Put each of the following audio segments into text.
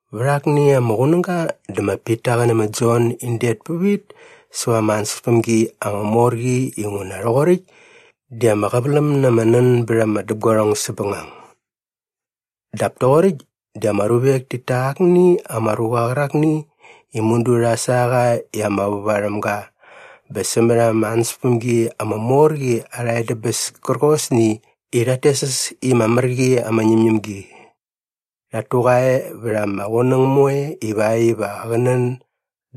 Vät akni ama qunäga dä ma Pita qä nä ma Jon in det pävit säva ama ansäspämgi ama mor qi inguna rhoqoräkt di ama qäväläm na ama nän bät ama däpguarhong säpbängang. Dap toqoräkt di ama ruvek tit ta akni ama ruqa qärakni i mudu rha sa qa i ama väva rhäm ga bä sämät ama ansäspämgi ama mor qi arha edäbäs kärqosni i rhat tes äs i ma Mär Qi ama Ñämñämgi. Rhat tu qa e vät ama qunäng moe ivakt iva qä nän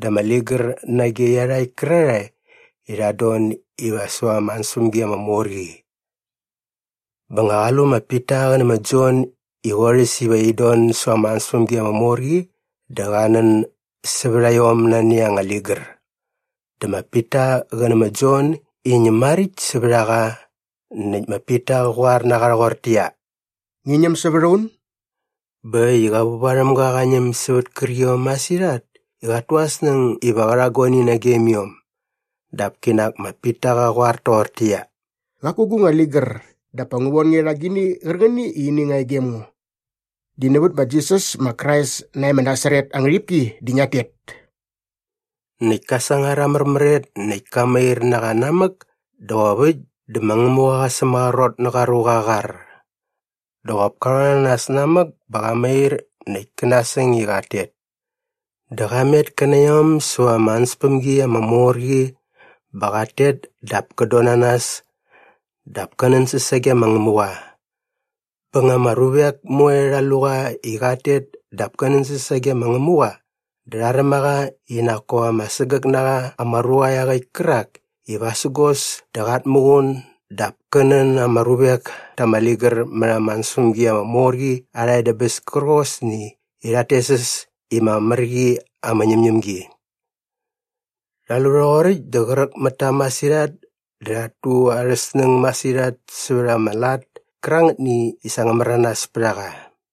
da ama ligär nage iarhakt kärarhae i rhat don iva säva ama ansäspämgi ama mor qi. Bä nga qa lu ma Pita qä nä ma Jon i qorhäs iva in don säva ama ansäspämgi ama mor qi dä qa nän sävät a iom nani anga ligär. Dä ma Pita qä nä ma Jon in ñäm maräkt sävät a qa näkt ma Pita qa qoar na qa rhoqortäqyia, “Ngi ñäm sävät a un.” Bä äkt i qä vävarhämga qa ñäm sävät kärqiom masirhat i qat tu aa snäng iva qä rha guani nagem iom. Dap kinak ma Pita qa qoar toqortäqyia, “Qaku gu nga ligär dap pa ngu von nge rha agini qärqäni i ini nga e gem ngo. Di nävät ma Jisas ma Krais nae ma Nasaret aa ngärhipki di ngiat tet.” Näkt ka sangar aa märmäret näkt ka mair na qa namäk dä qop äkt dä ma Ngämuqa qa sämaqrot nä qa ruqa aa qar. Dä qop ka rhon na nas namäk bä qa mair näkt kä nasäng i qat tet. Dä qa met kä na iom säva ama ansäspämgi ama mor qi bä qat tet dap kät don na nas dap kä nänsäs sage ma Ngämuqa. Bä nga ama ruvek moe rha lu qa i qat tet dap kä nänsäs sage ma Ngämuqa dä rha räm a qa i nak kop ama sägäk na qa ama ruqa iaqäkt kärak i vasägos dä qat muqun dap kä nän ama ruvek ta ama ligär mät ama ansäspämgi ama mor qi arha edäbäs kärqosni i rhat tes äs i ma Mär Qi ama Ñämñämgi. Rha lu rhoqoräkt dä qräk mät ta masirhat dä rhat tu arhä snäng masirhat sävät ama lat kärangätni i sa ngä märanas pät a qa.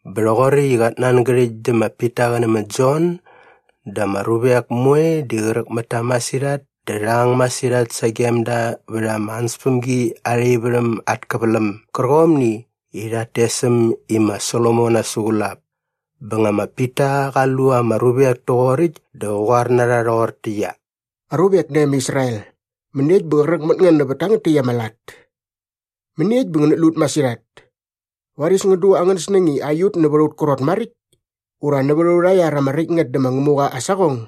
Bä rhoqoräkt i qat nangärhäkt dä ma Pita qä nä ma Jon dä ama ruvek moe di qräk mät ta masirhat dä rha ang masirhat sagem da vät ama ansäspämgi arha ivärhäm at käväläm gärqomni i rhat tes äm i ma Solomon Aa Suqulap. Bä nga ma Pita qa lu ama ruvek toqoräkt dä qä qoar na rha rhoqortäqyia, “Aruvek nae ma Israel, mäniekt bä qräk mät ngän nävät tangät täkt ama lat? Mäniekt bä ngänät lu ut masirhat? Varis ngän du angän snäng i aiut nävät aut krot maräkt ura nävät aurha iar ama räkt ngät dä ma Ngämuqa aa saqong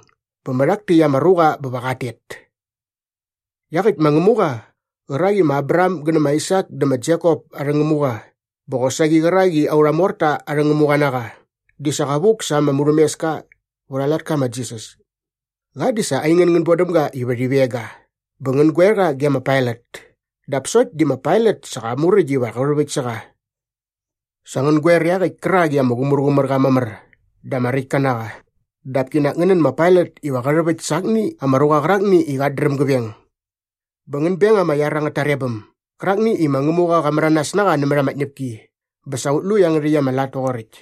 bä mä rhak täkt ama ruqa bä va qat tet. Iaqäkt ma Ngämuqa qärak i ma Abraham gä nä ma Aisak dä ma Jekop arhä Ngämuqa bä qosaqi qärak i aurha morta arhä Ngämuqa na qa di sa qa vuk sa ama murhämeska vät aa latka ma Jisas. Qa di sa aingän ngän bodäm ga iva rhi veng ga bä ngän goer qa ge ma Pailat dap sokt di ma Pailat sa qa muräkt iva qä rhäväkt sä qa. “Sa ngän goer iaqäkt kärak i ama Qumärqumärqa Mamär dä ama Räktka na qa dap kinak ngän nän ma Pailat iva qä rhäväkt sa akni ama ruqa qärakni i qat dräm gä veng. Bä ngän beng ama iar angät tarebäm gärakni i ma Ngämuqa qa märanas na qa nämät ama tñäpki bä sa ut lu iangärhäkt ama lat toqoräkt.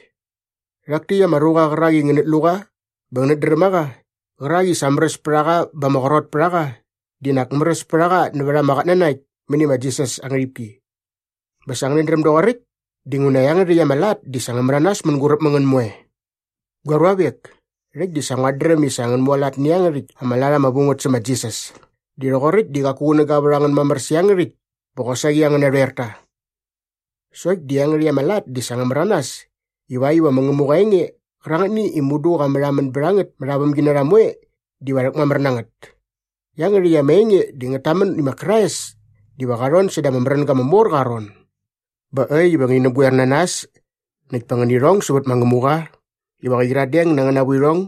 Rhak täkt ama ruqa qärak i ngänät lu qa bä ngänät dräm a qa qärak i sa märäs pät a qa bä ama qrot pät a qa di nak märäs pät a qa nävät ama qatnanakt mäni ma Jisas aa ngärhipki. Bä sa ngänät dräm doqoräkt dinguna iangärhäkt ama lat di sa ngä märanas mänguräp mä ngän moe. “Gua ruavek, rhäkt di sa nguat dräm i sa ngän mualat nä iangärhäkt ama lat ama vu ngät sä ma Jisas di rhoqoräkt di qaku qunäga vät a ngän mamär sä iangärhäkt bä qosaqi angän narhoerta. Sokt di iangärhäkt ama lat di sa ngä märanas ivakt iva ma Ngämuqa aa enge qärangätni i mudu qa märhamän bät a ngät mät aa vämginarha moe diva rhäkmamär na ngät. Iangärhäkt ama enge di ngät tamän i ma Krais diva qa rhon säda ama märänga ama mor qa aa ron. Bä äkt iva ngäni näpgoer na nas näkt pa ngäni rhong sävät ma Ngämuqa ivakt iva qä qyiradeng na angäna vuirhong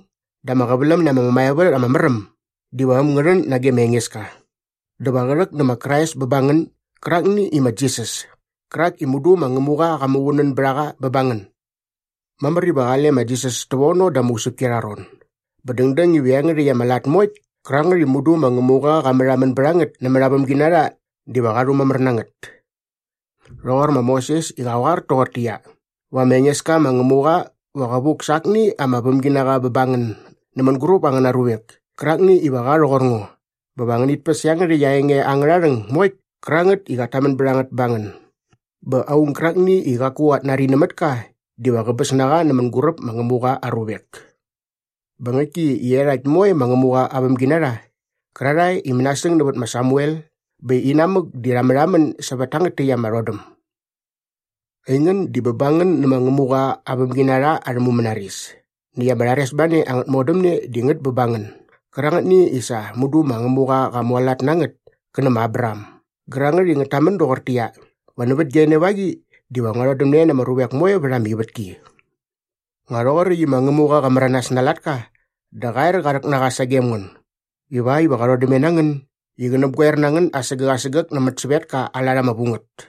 dä ama qäväläm na ama mämaevät ama mär äm diva äm ngä rhän nage ma Engeska. Dä va qä rhäk nä ma Krais bä ba ngän gärakni i ma Jisas kärak i mudu ma Ngämuqa qa muqunän bät a qa bä ba ngän. Mamär iva qale ma Jisas tävono da ama usäpki arha ron bä dängdäng iva iangärhäkt ama lat moekt kärangät i mudu ma Ngämuqa qa märhamän bät a ngät nämät aa vämginarha diva qa rhumamär na ngät. “Rhoqor ma Moses i qa qoar toqortäqyia, ‘Va ma Engeska ma Ngämuqa va qä vuk sa akni aa vämginaqa bä ba ngän nä mänguräp angäna ruvek kärakni iva qa rhoqor ngo bä va ngänit päs iangärhäkt aa enge angärha rhäng moekt kärangät i qat tamän bät a ngät ba ngän. Bä aung gärakni i qaku qat nari nämät ka diva qäbäs na qa nä mänguräp ma Ngämuqa aa ruvek.’ “Bä ngäktki i iarhakt moe ma Ngämuqa aa vämginarha qärarhae i mänasäng nävät ma Samuel bä inamäk di rha märhamän sävät tangät täkt ama rhodäm. Aingän di bä ba ngän nä ma Ngämuqa aa vämginarha arhä mumänaris näkt ama rharesbane angät modämne di ngät bä ba ngän gärangätni i sa mudu ma Ngämuqa qa mualat na ngät kä nä ma Abraham gärangät i ngät tamän doqortäqyia, ‘Va nävät gia enevaqi diva ngua rhodämne na ama ruvek moe vät ama ivätki.’ Nga rhoqoräkt i ma Ngämuqa qa märanas na aa latka dä qa er qa rhäk na qa sagem ngän ivakt iva qa rhodämne na ngän i qä näpgoer na ngän asägäk asägäk nämät sävetka aa lat ama vu ngät.”